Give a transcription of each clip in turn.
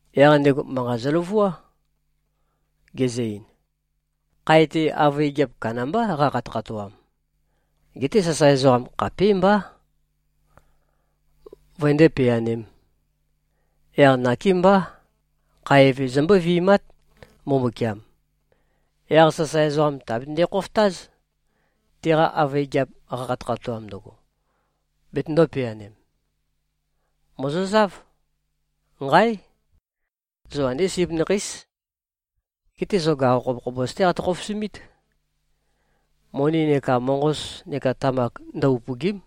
Yaq ndego manqa zøløvuá, gezø-ein, “Khae-te avøe gigiap kandambá qakhatøkhatoam. Geté sasae ezoqam khapímbá, vøndé-peanēm. Yaq nakémbá. Khae eve, zombó-vi꞉mát, Mbumbukiam. Yaq sasae ezoqam, tèabetønde-khofotáz, teqa avøe gigiap qakhatøkhatoam ndøgo, betøndō-peanem. Mòzozáv. Nqáe! Zo andé sip nakheís. Geté zo gaqo khobokhobos-té qatø-khofosumít. Moni neka moqos neka tamak ndø-upø̀gi᷄m.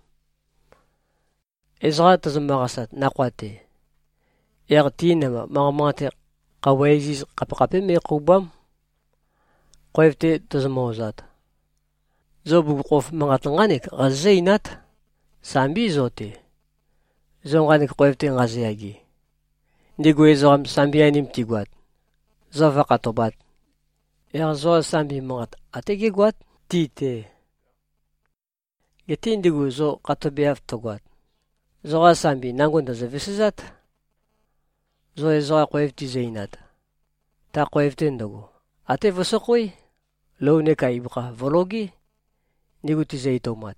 Ezoqa tozomø-qasat nakhoa-te, yaq ti namba manqa manqate-te, khøuwa iziz khapekhapé me꞉khòuba᷄m. Khoev-te tozomø-ozat, zo bugukhokhof manqat nqánek qazozǿ-einát, ‘Sambí zo-te, zo nqanek khoev-te nqazoyage.’ Ndigu ezoqam, sambi-anim tigoat, zo vǿkhatobāt, yaq zoqa sambi manqat, até gégoát ti-te. Geté ndigu zo khatobeav tøgoat, zoqa sambi nango ndø̀zø-vesezát. Zo ezoqa khoev tizø-einat, ta khoev-te ndøgo, até vøsøkhoé. Lou neka ibøkha vø̀logé, ndigu tizø-etoumat.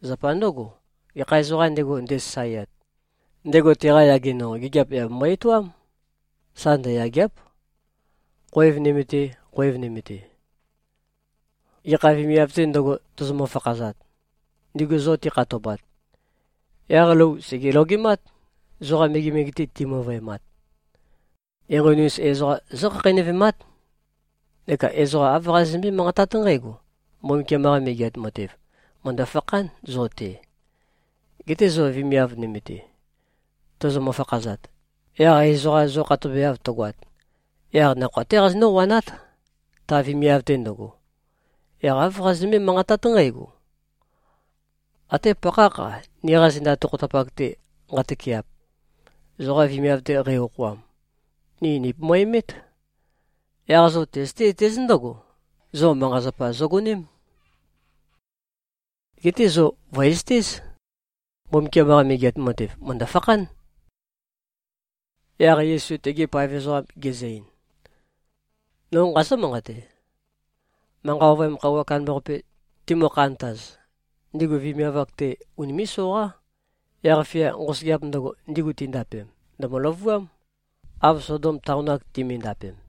Zapa ndǿgo, gekha ezoqām ndego, ndesasaeat, ndego teqa yage nonqo gigiap yà bembo-etoám. Sa ndøyàgea᷄p, khoev nøme-te, khoev nøme-te. Gekha vemiav-tē ndøgo, tozomø-fakhazat, ndigu zo tikhatobat, yaq lou sège-logemát, zoqa megemege-te timøvøemat. Enqoni-us ezoqam zókhakheinøvemát, neka ezoqa āv qazozømbé-manqatát nqǽgo, ‘Mbumbukiam-qa Megeat Matev, mø̀ndø-fakhán zo-te.’ Geté zo vemiav nøme-te tozomø-fakhazat, yaq ezoqa zo khatobeav tøgoat, yaq nakhoa-té qazonǿ-wanát, ta vemiav-te ndøgo. Yaq āv qazozømbé-manqatát nqǽgo, ‘Até pakhákh-a, niqa zenda tokhotapak-te nqatøkeap, zoqa vemiav-te qei-okhoam, ni nìpomoemét. Yaq zo tøzøté-zøtéz ndǿgo, zo manqa-zapa zogoném. Geté zo vø̀ezøtéz, Mbumbukiam-qa Megeat Matev, mø̀ndø-fakhán.’” Yaq Yesu tegi paev ezoqam gezø-ein, “No nqazǿ-manqate. Manqa Ovøyam Khøuwa Kandambaqape timø-khantaz, ndigu vemiav-ak-te unimé꞉-soqá. Yaq-fia nqosøgeap ndøgo, ndigu tindapem, ndø̀mø-løvuám, av Sodom taon-ak timindapem.”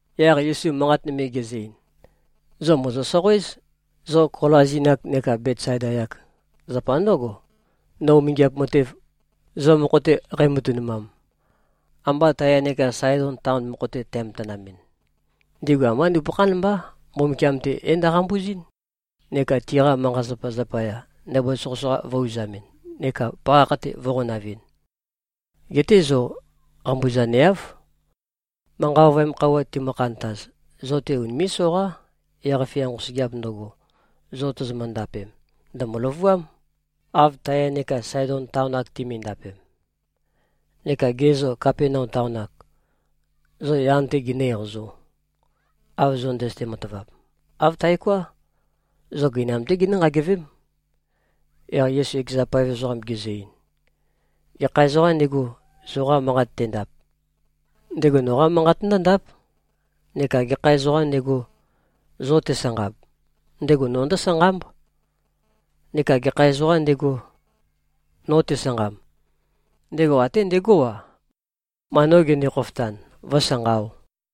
Yaq Yesu manqat nøme gezø-ein, “Zo mòzo-soqoéz, zo Kolazin-ak neka Betsaida-yak. Zapa ndǿgo, no umingiap matev, zo mokho-te qæmatønumam, ambā Taya neka Saedon taon mokho-te tæmatanamɨn, ndigu ambá nupøkhán mbá, Mbumbukiam-te é-ndo꞉qambuzɨ́n, neka tiqa manqa-zapazapa zapaya, ndabua soqøsoqa vø̄-uzamɨn neka pakhakh-te vø̄qonavɨn. Geté zo qambuzaneáv. Manqa ovøyam khøuwa timø-khantaz, zo-te unimé꞉-soqá. Yaq-fia nqosøgeap ndøgo, zo tozomø-ndapem, ndø̀mø-løvuám, av Taya neka Saedon taon-ak timindapem. Neka ge zô, Kapenaum taon-ak? Zo, yan-té ginǿ-eqazō, av zo ndøzøte-matavap? Āv taoká. Zo gøinam-té ginǿ-nqagevém.” Yaq Yesu ekeza paev ezoqam gezø-ein, “Gekha ezoqām ndego, zoqa manqat tendap, ndego noqá manqat ndǿndáp. Neka gekha ezoqām ndego, zo tesanqab, ndego no ndǿsanqámb. Neka gekha ezoqām ndego, no tesanqamb, ndego até ndegó-a, ma no gende-khofotan, vǿsanqaō.”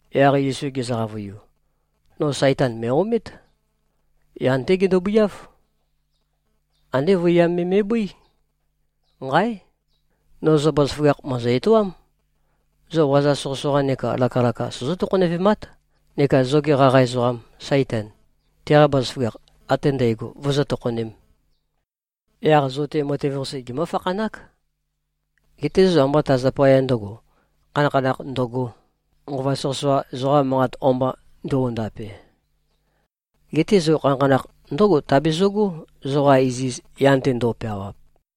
Yaq Yesu gezø-qavøiu, “No Saitan mø̀e-omét. Yan-té gendobøiáv. Andé vøiyam me me꞉bøí. Nqáe! No zo bazaføgakh mø̀ezø-etoám. Zo waza soqøsoqa neka lakalaka sozó-tokhonevemát, neka zoge qaqa ezoqam, Saitan, teqa bazaføgakh ate ndægo vozó-tokhonēm. Yaq zo-te matev-qase gemǿ-fakhanák. Geté zo ambá ta zapaya ndø̄go, khanakhanakh ndøgō, nqova soqøsoqa zoqa manqat o-mba nduondape, geté zo khanakhanakh ndǿgo tabezøgó, zoqa iziz yan-te ndo꞉peawap.”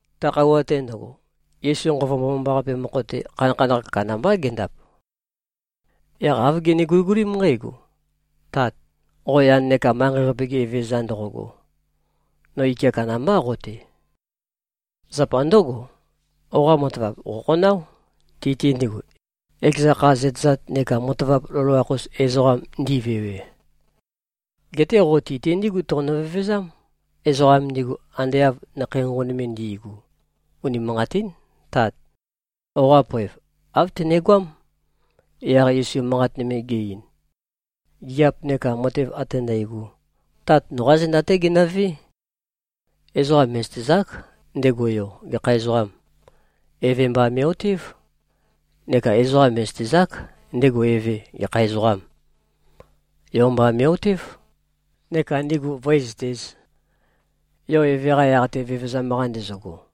Ta khøuwa-te ndøgo, Yesu Nqova Mbomambaqape mokho-te, khanakhanakh kandambá gendap. Yaq āv gene-guligulím nqǽgo, “Tat, qo yan neka manqei-qape-ge Evezøza ndoqoqo. No ike kandambá qo-te. Zapa ndǿgo, qoqa matavap qòkhonáo, ti-te ndigu, ekeza kha zøtezat neka matavap loloakh-us ezoqam ndivewe. Geté qo ti-te ndígu toqonø-vevezám, ezoqam ndigu ande av nakhei nqonqon me ndi꞉gu. Unimanqatín. Tát! Qoqa poev, āv tønegoám.” Yaq Yesu manqat nøme ge-ein, “Gigiap neka matev ate nqægo, Tat noqá zenda-té genøvé. Ezoqa mè꞉zøtezák, ndego Yo gekha ezoqâm. Eve mba me꞉-otév. Neka ezoqa mè꞉zøtezák, ndego Eve gekha ezoqâm. Yo mba me꞉-otév, neka ndigu vǿezøtēz, Yo Eve-qa yaq-te vevezam-qa ndezøgo.”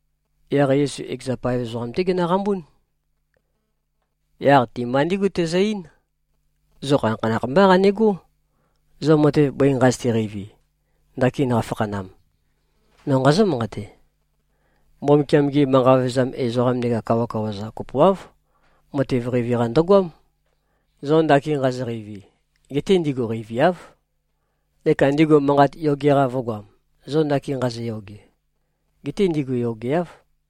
Yaq Yesu ekeza paev ezoqam-té genøqambún. Yaq ti-mba ndígu tezø-eín, “Zo khanakhanakh mbá qanegó, zo matev bøi nqazøte-qeivi, ndakin nqafakhanam. No nqazǿ-manqate: Mbumbukiam-gi manqa vevezam ezoqam neka kawakawa-za kopoáv, matev qeivi-qa ndøgoám, zo ndakin nqazo-qeivi. Geté ndigu qeiviáv. Neka ndigu manqat yoge-qa vø̄goam, zo ndakin nqazoyoge. Geté ndigu yogeáv.”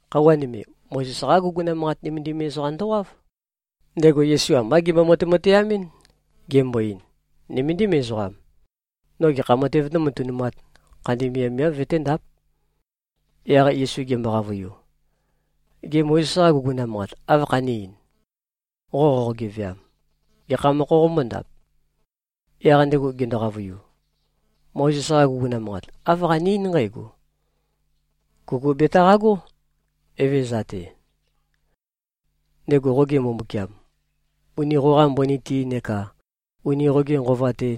Khøuwa nøme, Mozes-qá guguna manqat nømendim ezoqam ndowáv. Ndego Yesu ambá gembo-matemateamɨ́n, gembo-ein, “Nøméndim ezoqam. No gekha matēv nómatønumāt, khandi miavmiáv vøténdáp?” Yaq Yesu gembo-qavøiu, “Gê, Mozes-qa guguna manqat áv khané-ein? Qo qoqo-geveam, gekha mokho qombóndap?” Yaq ndego gendo-qavøiu, “Mozes-qa guguna manqat, āv qane-eín nqǽgo, ‘Kuku betaqagó, Evezøza-te, ndego qoge Mbumbukiam, uni qoqa mbøni-te neka uni qoge nqova-te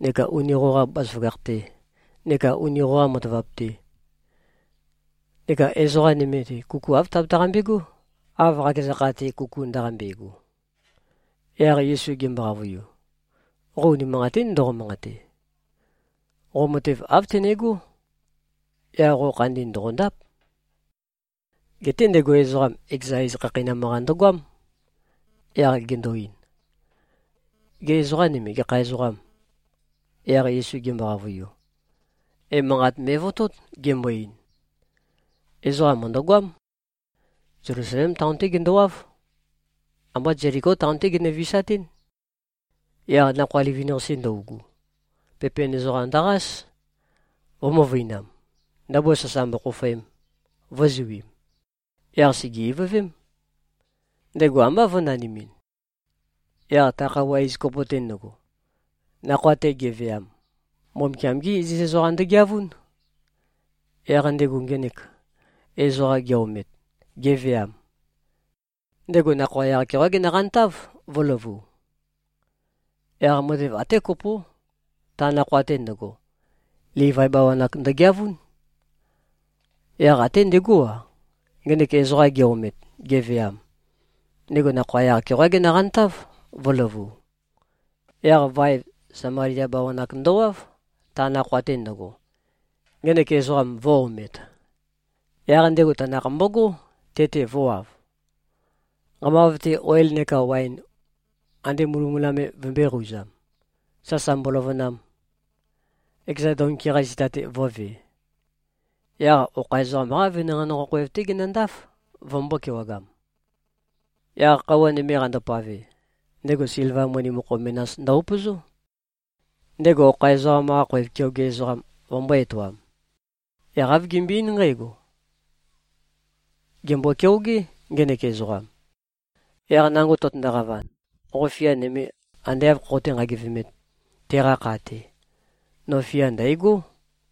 neka uni qoqa bazaføgakh-te neka uni qoqa matavap-te. Neka ezoqa nøme-te, kuku āv tabetaqambe꞉gó, av qakeza kha-te, kuku ndaqambe꞉go.’” Yaq Yesu gembo-qavøiu, “Qo unimanqatín ndoqo-manqate. Qo matev āv tønegó. Yaq qo khandi ndòqondáp.” Geté ndego ezoqam, ekeza iz khakheinam-qa ndøgoám, yaq gendo-ein, “Gê, ezoqa nøme, gekha ezoqâm?” Yaq Yesu gembo-qavøiu, emanqat me꞉votót, gembo-ein, “Ezoqa mø̀ndøgoám. Zelusalem taon-té gendowáv. Ambá Zeliko taon-té genø-visatɨ́n. Yaq nakhoa livin-qase ndøugu, pepen ezoqam ndøqás, vø̄-møvøinam, ndabua sasa mbokhofoem, vø̄zuim. Yaq sège-ivøvém. Ndego ambá vø̄nanimin. Yaq ta khøuwa iz kopo-te ndøgo, nakhoa-te ge꞉veam, Mbumbukiam-gé iziz ezoqam ndøgeavún. Yaq ndego ngenek ezoqam ge-omet, geveam, ndego nakhoa yaq-keoqá genøqantáv, vø̄løvu. Yaq matev até kopó, ta nakhoa-te ndøgo, Livai bawan-ak ndøgeavún. Yaq até ndegó-a, ngenek ezoqam ge-omet, geveam, ndego nakhoa yaq-keoqá genøqantáv, vø̄løvu. Yaq vaev, Samalia bawan-ak ndowáv, ta nakhoa-te ndøgo, ngenek ezoqam vø̄-omet. Yaq ndego tanakh mbogó, te-te vø̄wav, nqamav-te oil neka waen ande mulømula me vømbø̄e-qouzam, sasa mboløvønam, ekeza donki-qa zita-te vō꞉ve. Yaq okha ezoqam-qá venanqei nonqo khoev-té genøndáf, vømbō-kewagam. Yaq khøuwa nøme qandopave, ndego silva moni mokho menas ndø-upøzó, ndego okha ezoqam-qa khoev keoge ezoqam vømbō-etoam. Yaq āv gembøe-eín nqǽgo, ‘Gèmbo-keogé, ngenek ezoqam. Yaq nango tøtøndo-qavan, qo fia nøme ande āv khoqoté-nqagivemēt, teqa kha-te, no fia ndæ̀gó.’”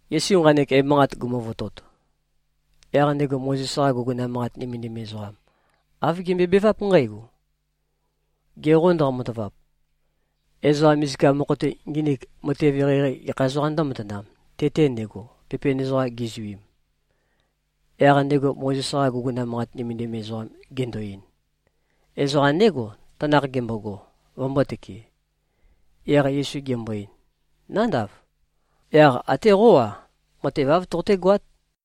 Yesu nqanek emanqat gumuvotot, yaq ndego Mozes-qa guguna manqat nømendim ezoqam, āv gembøebeváp nqǽgo, “Ge qô ndoqo-matavap? Ezoqa misika mokho-te nginik, matev eqeieqei, gekha ezoqām ndǿmatanam, te-te ndego, pepen ezoqam gizuim?” Yaq ndego Mozes-qa guguna manqat nømendim ezoqam gendo-ein, “Ezoqam ndégo, tanakh gembogo, vømbōtøke.” Yaq Yesu gembo-ein, “Nándav. Yaq até qó-a, matev āv toqotégoát.”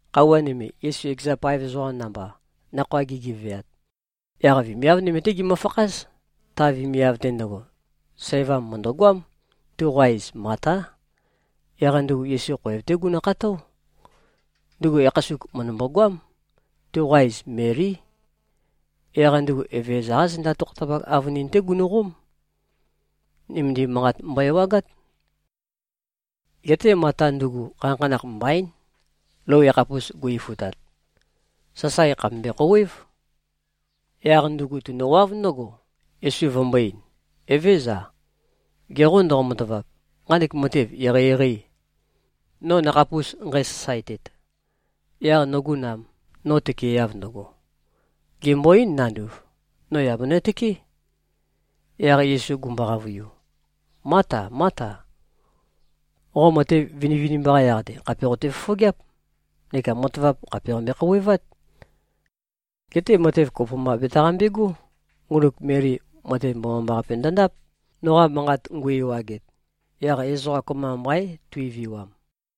Khøuwa nøme, Yesu ekeza paev ezoqam namba, nakhoa gigeveat, yaq vemiav nøme-té gimøfakház. Ta vemiav-te ndøgo, sævam mø̀ndøgoám. Tuqa iz Matá. Yaq ndugu Yesu khoev-té gunukható. Ndugu yakhasuk mø̀ndømbo-goám. Tuqa iz Melí. Yaq ndugu Evezøza-qá zenda tokhotapak avønin-té gunøqóm. Nømendim manqat mbøe-ewagát. Geté Mata ndugu, khanakhanakh mbaín, lou yakhapus gu-ifutat. Sasae khàpe mbøe-khouwév. Yaq ndugu tunøwáv ndǿgo, Yesu vømbō-ein, “Evézøza. Ge qô ndoqo-matavap, nqanek matev eqeieqeî, no nakhapus nqæsasaetet, yaq nogu nam, no tøkeeav ndøgo? Gèmbo-eín, nanduv, no yà benøtøké.” Yaq Yesu gumbo-qavøiu, “Máta, Máta! Qo matev vinivinimba-qa yaq-te, khàpe qote-fofogeáp neka matavap khàpe qambe-khouwevát. Geté matev kopo mba betaqambegó. Ngunuk Meli, matev mbomambaqape ndøndáp, noqa manqat ngu-ewaget. Yaq ezoqa kopømba mbaín, tuiviwam.”